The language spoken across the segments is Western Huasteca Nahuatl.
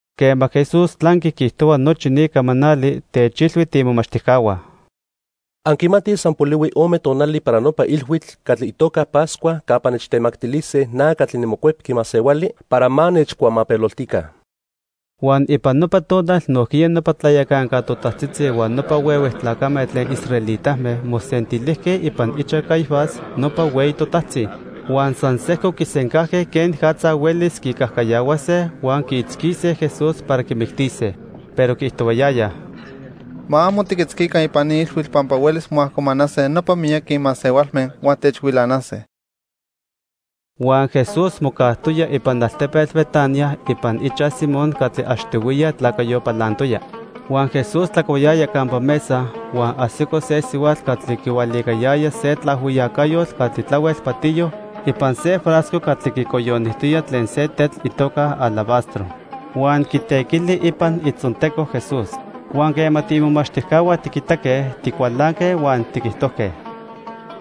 Quema Jesús tlanqui quiijtohua nochi ni camanali, techilhui tiimomachtijcahua: —Anquimatij san polihui ome tonali para nopa ilhuitl catli itoca Pascua campa nechtemactilise na catli niMocuepqui Masehuali para ma nechcuamapeloltica. Huan ipan nopa tonal nojquiya nopa tlayacanca totajtzitzi huan nopa huehue tlacame tlen israelitame mosentilijque ipan ichaj Caifás nopa hueyi totajtzi. Huan san sejco quisencajque quenicatza huelis quicajcayahuase huan quiitzquise Jesús para quimictise. Pero quiijtohuayayaj: —Ma amo tiquitzquica ipan ni ilhuitl pampa huelis moajcomanase nopa miyaqui masehualme huan techhuilanase. Huan Jesús mocajtoya ipan altepetl Betania ipan ichaj Simón catli achtihuiya tlacayo palantoya. Huan Jesús tlacuayaya campa mesa huan ajsico se sihuatl catli quihualicayaya se tlaajhuiyacayotl catli tlahuel patiyo ipan se frasco catli quicoyonijtoya tlen se tetl itoca alabastro. Huan quitequili ipan itzonteco Jesús. Huan quema tiimomachtijcahua tiquitaque, ticualanque huan tiquijtojque: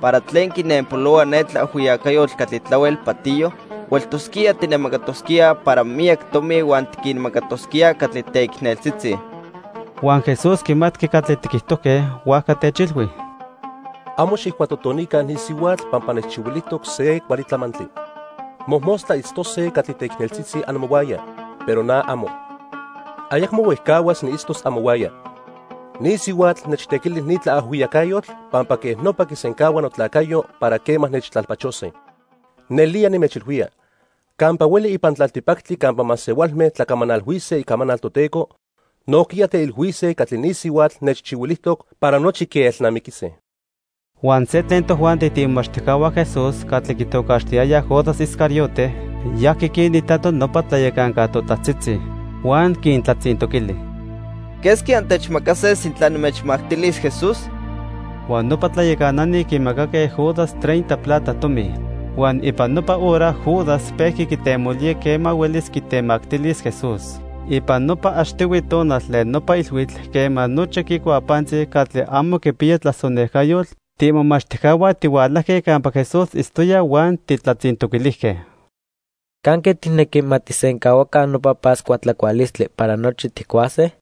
—¿Para tlen quinenpolohua ne tlaajhuiyacayotl catli tlahuel patiyo? Hueltosquía tijnemacatosquíaj para miyac tomi huan tiquinmacatosquíaj catli teicneltzitzi. Huan Jesús quimatqui catli tiquijtojque, huajca techilhui: —Amo xijcuatotonica ni sihuatl pampa nechchihuilijtoc se cuali tlamantli. Mojmostla itztose catli teicneltzitzi amohuaya, pero na amo. Ayacmo huejcahuas niitztos amohuaya. Ni sihuatl nechtequili ni tlaajhuiyacayotl pampa quej nopa quisencahua notlacayo para quema nechtlalpachose. Nelía nimechilhuía, campa hueli ipan tlaltipactli campa masehualme tlacamanalhuise icamanal Toteco, nojquiya teilhuise catli ni sihuatl nechchihuilijtoc para nochi quielnamiquise. Huan se tlen tojuanti tiimomachtijcahua Jesús catli quitocaxtiyayaj Judas Iscariote, yajqui quinitato nopa tlayacanca totajtzitzi. Huan quintlatzintoquili: —¿Quesqui antechmacase sintla nimechmactilis Jesús? Huan nopa tlayacanani quimacaque Judas treinta plata tomi. Huan ipan nopa hora Judas pejqui quitemolía quema huelis quitemactilis Jesús. Ipan nopa achtihui tonal tlen nopa ilhuitl, quema nochi quicuaj pantzi catli amo quipiya tlasonejcayotl, tiimomachtijcahua tihualajque campa Jesús itztoya huan tijtlatzintoquilijque: —¿Canque tijnequi ma tijsencahuaca nopa Pascua tlacualistli para nochi tijcuase?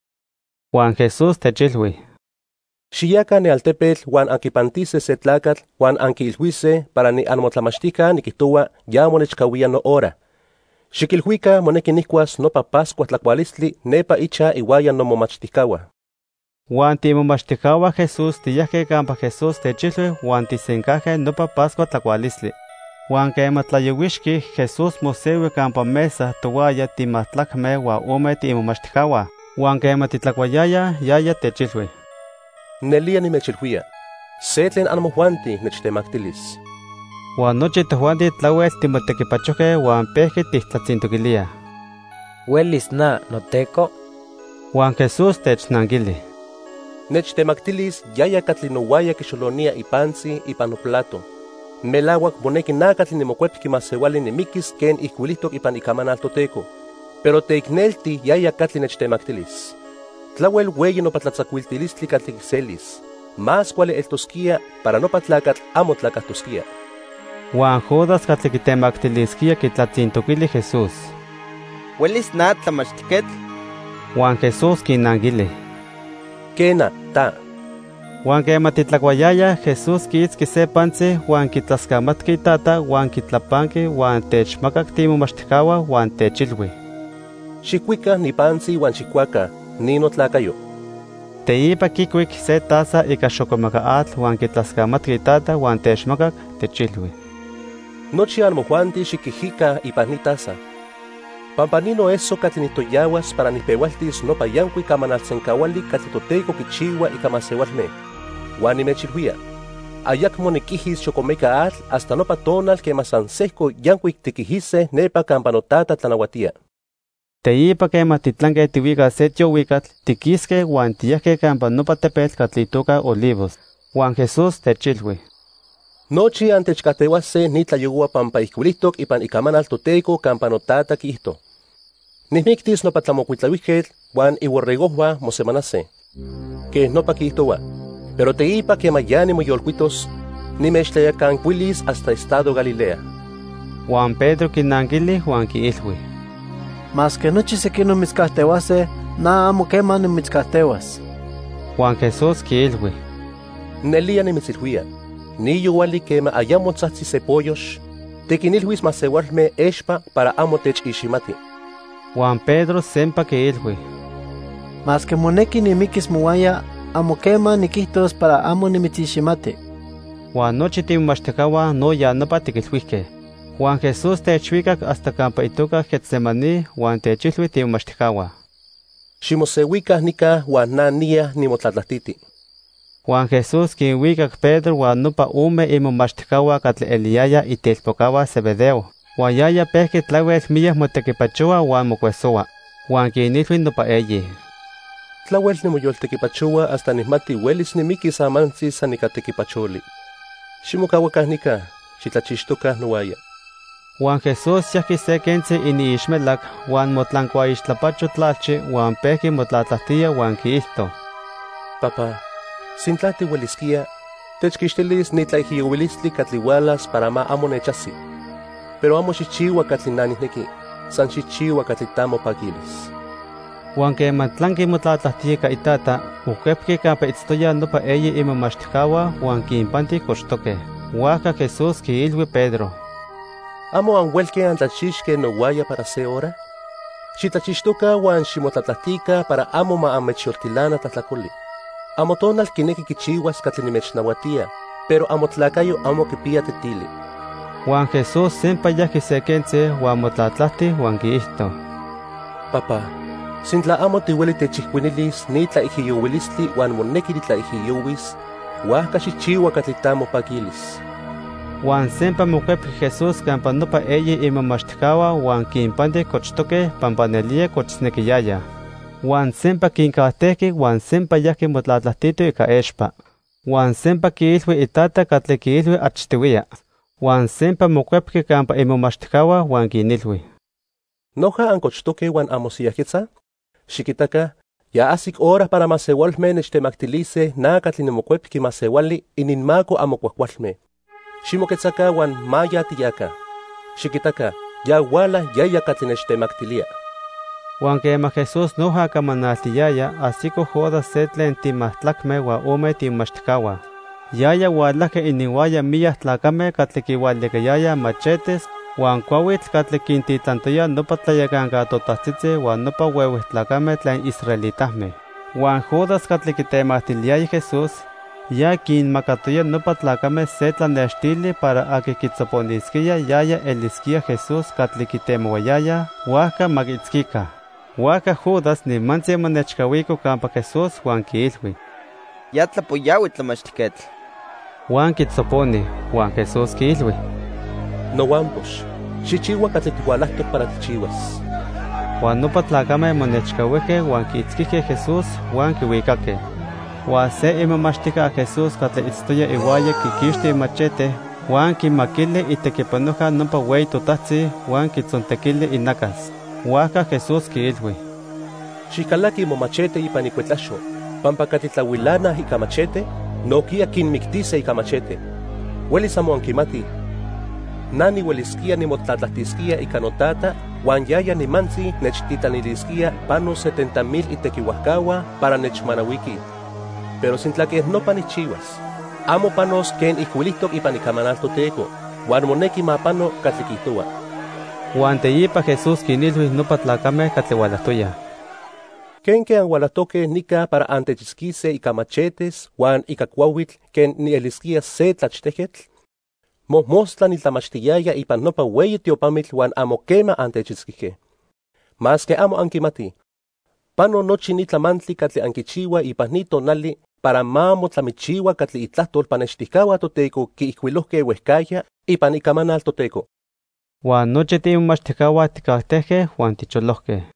Huan Jesús techilhui: —Xiyaca ne altepetl huan anquipantise se tlacatl huan anquiilhuise para niamotlamachtijca niquijtohua ya monechcahuía nohora. Xiquilhuica monequi nijcuas nopa Pascua tlacualistli nepa ichaj ihuaya nomomachtijcahua. Huan tiimomachtijcahua Jesús tiyajque campa Jesús techilhui huan tijsencajque nopa Pascua tlacualistli. Huan quema tlayohuixqui, Jesús mosehui campa mesa tohuaya timajtlacme huan ome tiimomachtijcahua. Huan quema titlacuayayaj, yaya techilhui: —Nelía nimechilhuía, se tlen amojuanti nechtemactilis. Huan nochi tojuanti tlahuel timotequipachojque huan pejqui tijtlatzintoquilíaj: —¿Huelis na, noTeco? Huan Jesús technanquili: —Nechtemactilis yaya catli nohuaya quixolonía ipantzi ipan noplato. Melahuac monequi na catli niMocuepqui Masehuali nimiquis quen ijcuilijtoc ipan Icamanal Toteco, pero teicnelti yaya catli nechtemactilis. Tlahuel hueyi nopa tlatzacuiltilistli catli quiselis. Más cuali eltosquía para nopa tlacatl amo tlacajtosquía. Huan Judas catli quitemactilisquía quitlatzintoquili Jesús: —¿Huelis na, Tlamachtijquetl? Huan Jesús quinanquili: —Quena, ta. Huan quema titlacuayayaj, Jesús quiitzqui se pantzi huan quitlascamatqui Itata huan quitlapanqui, huan techmacac tiimomachtijcahua huan techilhui: —Xijcuica ni pantzi huan xijcuaca. Ni notlacayo. Teipa quicuic se taza ica xocomeca atl huan quitlascamatqui Itata huan techmacac, techilhui: —Nochi amojuanti xiquijica ipan ni taza, pampa ni noeso catli nijtoyahuas para nijpehualtis nopa yancuic camanal sencahuali catli Toteco quichihua ica masehualme. Huan nimechilhuía, ayacmo niquijis xocomeca atl hasta nopa tonal quema san sejco yancuic tiquijise nepa campa noTata tlanahuatía. Teipa quema titlanque tihuicaj se tiohuicatl, tiquisque huan tiyajque campa nopa tepetl catli itoca Olivos. Huan Jesús techilhui: —Nochi antechcajtehuase ni tlayohua pampa ijcuilijtoc ipan Icamanal Toteco campa noTata quiijto: 'Nijmictis nopa tlamocuitlahuijquetl huan iborregojhua mosemanase.' Quej nopa quiijtohua. Pero teipa quema ya nimoyolcuitos, nimechtlayacancuilis hasta estado Galilea. Huan Pedro quinanquili huan quiilhui: —Masque nochi sequinoc mitzcajtehuase, na amo quema nimitzcajtehuas. Huan Jesús quiilhui: —Nelía nimitzilhuía, ni yohuali quema ayamo tzajtzi se poyox, tiquinilhuis masehualme expa para amo techiximati. Huan Pedro sempa quiilhui: —Masque monequi nimiquis mohuaya, amo quema niquijtos para amo nimitziximati. Huan nochi tiimomachtijcahua no ya nopa tiquilhuijque. Huan Jesús techhuicac hasta campa itoca Getsemaní huan techilhui tiimomachtijcahua: —Ximosehuica nica huan na niya nimotlatlajtiti. Huan Jesús quinhuicac Pedro huan nopa ome imomachtijcahua catli eliyayaj itelpocahua Zebedeo. Huan yaya pejqui tlahuel miyac motequipachohua huan mocuesohua. Huan quinilhui nopa eyi: —Tlahuel nimoyoltequipachohua hasta nijmati huelis nimiquis amantzi san ica tequipacholi. Ximocahuaca nica. Xitlachixtoca nohuaya. Huan Jesús yajqui se quentzi iniixmelac huan motlancuaixtlapacho tlalchi huan pejqui motlatlajtía huan quiijto: —Papá, sintla tihuelisquía, techquixtilis ni tlaijiyohuilistli catli hualas para ma amo nechajsi. Pero amo xijchihua catli na nijnequi, san xijchihua catli ta mopaquilis. Huan quema tlanqui motlatlajtía ica Itata, mocuepqui campa itztoyaj nopa eyi imomachtijcahua huan quinpanti cochtoque. Huajca Jesús quiilhui Pedro: —¿Amo anhuelque antlachixque nohuaya para se hora? Xitlachixtoca huan ximotlatlajtica para amo ma anmechyoltilana tlajtlacoli. Amotonal quinequi quichihuas catli nimechnahuatía, pero amotlacayo amo quipiya tetili. Huan Jesús sempa yajqui se quentzi, huan motlatlajti huan quiijto: —Papá, sintla amo tihueli techijcuinilis ni tlaijiyohuilistli huan monequi nitlaijiyohuis, huajca xijchihua catli ta mopaquilis. Huan sempa mocuepqui Jesús campa nopa eyi imomachtijcahua huan quinpanti cochtoque pampa nelía cochisnequiyayaj. Huan sempa quincajtejqui huan sempa yajqui motlatlajtito ica expa. Huan sempa quiilhui Itata catli quiilhui achtihuiya. Huan sempa mocuepqui campa imomachtijcahua, huan quinilhui: —¿Noja ancochtoque huan anmosiyajquetzaj? Xiquitaca, ya ajsic hora para masehualme nechtemactilise na catli niMocuepqui Masehuali ininmaco amo cuajcualme. Ximoquetzaca huan ma ya tiyaca. Xiquitaca, ya huala yaya catli nechtemactilía. Huan quema Jesús noja camanaltiyaya, ajsico Judas se tlen timajtlacme huan ome tiimomachtijcahua. Yaya hualajqui ininhuaya miyac tlacame catli quihualicayayaj machetes huan cuahuitl catli quintitlantoyaj nopa tlayacanca totajtzitzi huan nopa huehue tlacame tlen israelitame. Huan Judas catli quitemactiliyaya Jesús, ya quinmacatoya nopa tlacame se tlanextili para aqui quitzoponisquía, yaya elisquía Jesús catli quitemohuayayaj, huajca ma quiitzquica. Huajca Judas nimantzi monechcahuico campa Jesús huan quiilhui: —Ya tlapoyahui, Tlamachtijquetl. Huan quitzoponi. Huan Jesús quiilhui: —Nohuampox, xijchihua catli tihualajtoc para tijchihuas. Huan nopa tlacame monechcahuijque huan quiitzquijque Jesús, huan quihuicaque. Huan se imomachtijca Jesús catli itztoya ihuaya quiquixti imachete huan quimaquili itequipanojca nopa hueyi totajtzi, huan quitzontequili inacas. Huajca Jesús quiilhui: —Xijcalaqui momachete ipan icuetlaxo pampa catli tlahuilanaj ica machete, nojquiya quinmictise ica machete. ¡Huelis amo anquimatij! Na nihuelisquía nimotlatlajtisquía ica noTata huan yaya nimantzi nechtitlanilisquía pano setenta mil itequihuajcahua para nechmanahuiquij. Pero sintla quej nopa nijchihuas, amo panos quen ijcuilijtoc ipan Icamanal Toteco. Huan monequi ma pano catli quiijtohua. Huan teipa Jesús quinilhui nopa tlacame catli hualajtoyaj: —¿Quenque anhualajtoque nica para antechitzquise ica machetes huan ica cuahuitl quen nielisquía se tlachtejquetl? Mojmostla nitlamachtiyaya ipan nopa hueyi tiopamitl huan amo quema antechitzquijque. Masque amo anquimatij, pano nochi ni tlamantli catli anquichihuaj ipan ni tonali para ma motlamichihua catli itlajtol pannextijcahua Toteco quiijcuilojque huejcajya ipan Icamanal Toteco. Huan nochi tiimomachtijcahua tijcajtejque huan ticholojque.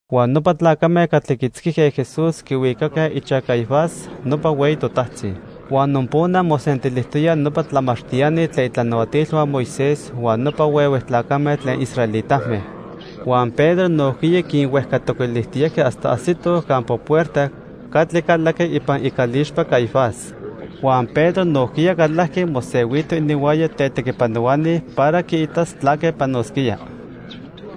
Huan nopa tlacame catli quiitzquijque Jesús quihuicaque ichaj Caifás, nopa hueyi totajtzi. Huan nopona mosentilijtoyaj nopa tlamachtiani tlen itlanahuatilhua Moisés huan nopa huehue tlacame tlen israelitame. Huan Pedro nojquiya quinhuejcatoquilijtiyajqui hasta ajsitoj campa puerta catli calaqui ipan icalixpa Caifás. Huan Pedro nojquiya calajqui, mosehuito ininhuaya tetequipanohuani para quiitas tlaque panosquía.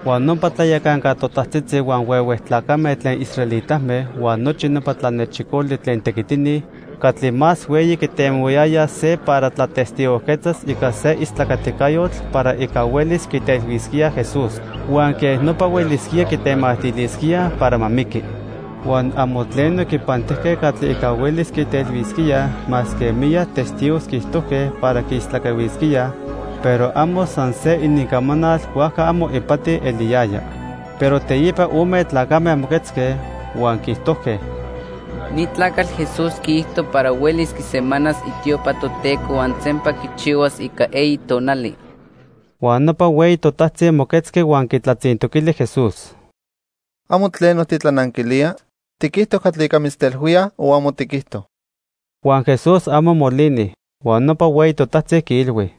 Huan nopa tlayacanca totajtzitzi huan huehue tlacame tlen israelitame huan nochi nopa tlanechicoli tlen tequitini catli más hueyi quitemohuayayaj se para tlatestigojquetzas ica se istlacaticayotl para ica huelis quitelhuisquíaj Jesús. Huan quej nopa huelisquía quitemactilisquíaj para ma miqui. Huan amo tleno quipantijque catli ica huelis quitelhuisquíaj masque miyac testigos quiijtojque para quiistlacahuisquíaj, pero amo san se inincamanal huajca amo ipati eliyaya. Pero teipa ome tlacame moquetzque, huan quiijtojque: —Ni tlacatl Jesús quiijto para huelis quisemanas itiopa Toteco huan sempa quichihuas ica eyi tonali. Huan nopa hueyi totajtzi moquetzqui huan quitlatzintoquili Jesús: —¿Amo tleno titlananquilía? ¿Tiquijto catli ica mitztelhuíaj o amo tiquijto? Huan Jesús amo molini. Huan nopa hueyi totajtzi quiilhui: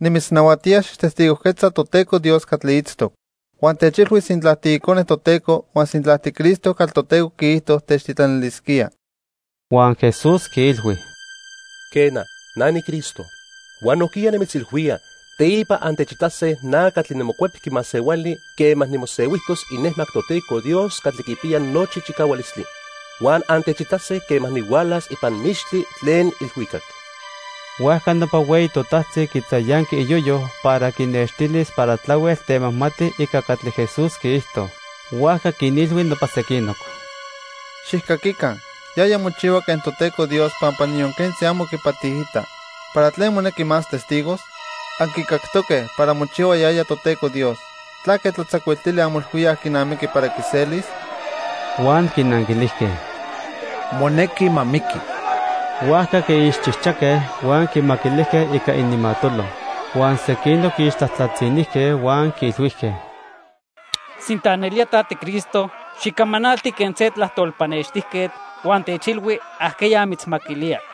—Nimitznahuatía xijtestigojquetza Toteco Dios catli itztoc. Huan techilhui sintla tiIcone Toteco huan sintla tiCristo catli Toteco quiijto techtitlanilisquía. Huan Jesús quiilhui: —Quena, na niCristo. Huan nojquiya nimitzilhuía, teipa antechitase na catli niMocuepqui Masehuali quema nimosehuijtos inejmac Toteco Dios catli quipiya nochi chicahualistli. Huan antechitase quema nihualas ipan mixtli tlen ilhuicac. Huajca nopa hueyi totajtzi quitzayanqui iyoyo para quinextilis para tlahuel temajmati ica catli Jesús quiijto. Huajca quinilhui nopa sequinoc: —Xijcaquica, yaya mochihua quen Toteco Dios pampa niyon quentzi amo quipatiita. ¿Para tlen monequi más testigos? Anquicactoque para mochihua yaya Toteco Dios. ¿Tlaque tlatzacuiltilistli anmoilhuíaj quinamiqui para quiselis? Huan quinanquilijque: —Monequi ma miqui. Huajca quiixchijchaque, huan quimaquilijque ica ininmatolo. Huan sequinoc quiixtlajtlatzinijque huan quiilhuijque: —Sintla nelía ta tiCristo, xicamanalti quen se tlajtol pannextijquetl huan techilhui ajqueya mitzmaquilía.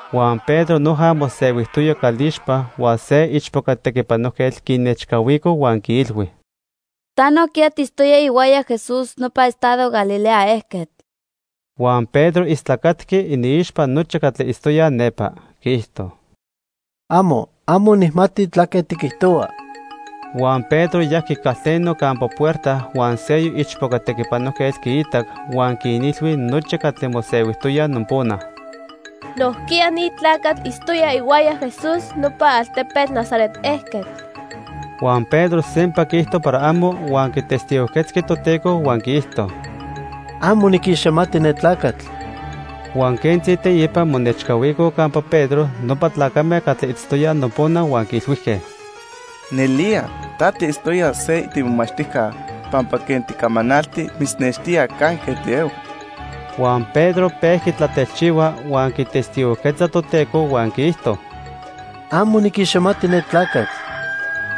Huan Pedro noja mosehuijtoya calixpa huan se ichpoca tequipanojquetl quinechcahuico huan quiilhui: —Ta nojquiya tiitztoya ihuaya Jesús nopona ipan estado Galilea ejquetl. Huan Pedro istlacatqui iniixpa nochi catli itztoyaj nepa. Quiijto: —Amo, amo nijmati tlaque tiquijtohua. Huan Pedro yajqui calteno campa puerta huan seyoc ichpoca tequipanojquetl quiitac huan quinilhui nochi catli mosehuijtoyaj nopona: —Nojquiya ni tlacatl itztoya ihuaya Jesús, nopa altepetl Nazaret ejquetl. Huan Pedro sempa quiijto para amo, huan quitestigojquetzqui Toteco huan quiijto: —Amo niquiximati ne tlacatl. Huan quentzi teipa monechcahuicoj campa Pedro nopa tlacame catli itztoyaj nopona huan quiilhuijque: —Nelía ta tiitztoya se tiimomachtijca pampa quen ticamanalti mitznextía canque tiehua. Huan Pedro pejqui tlatelchihua huan quitestigojquetza Toteco huan quiijto: —Amo niquiximati ne tlacatl.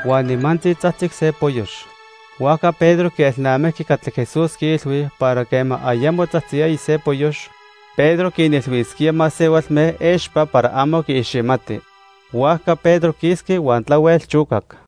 Huan nimantzi tzajtzic se poyox. Huajca Pedro quielnamijqui catli Jesús quiilhui para quema ayamo tzajtziyaya se poyox, Pedro quinilhuisquía masehualme expa para amo quiiximati. Huajca Pedro quisqui huan tlahuel chocac.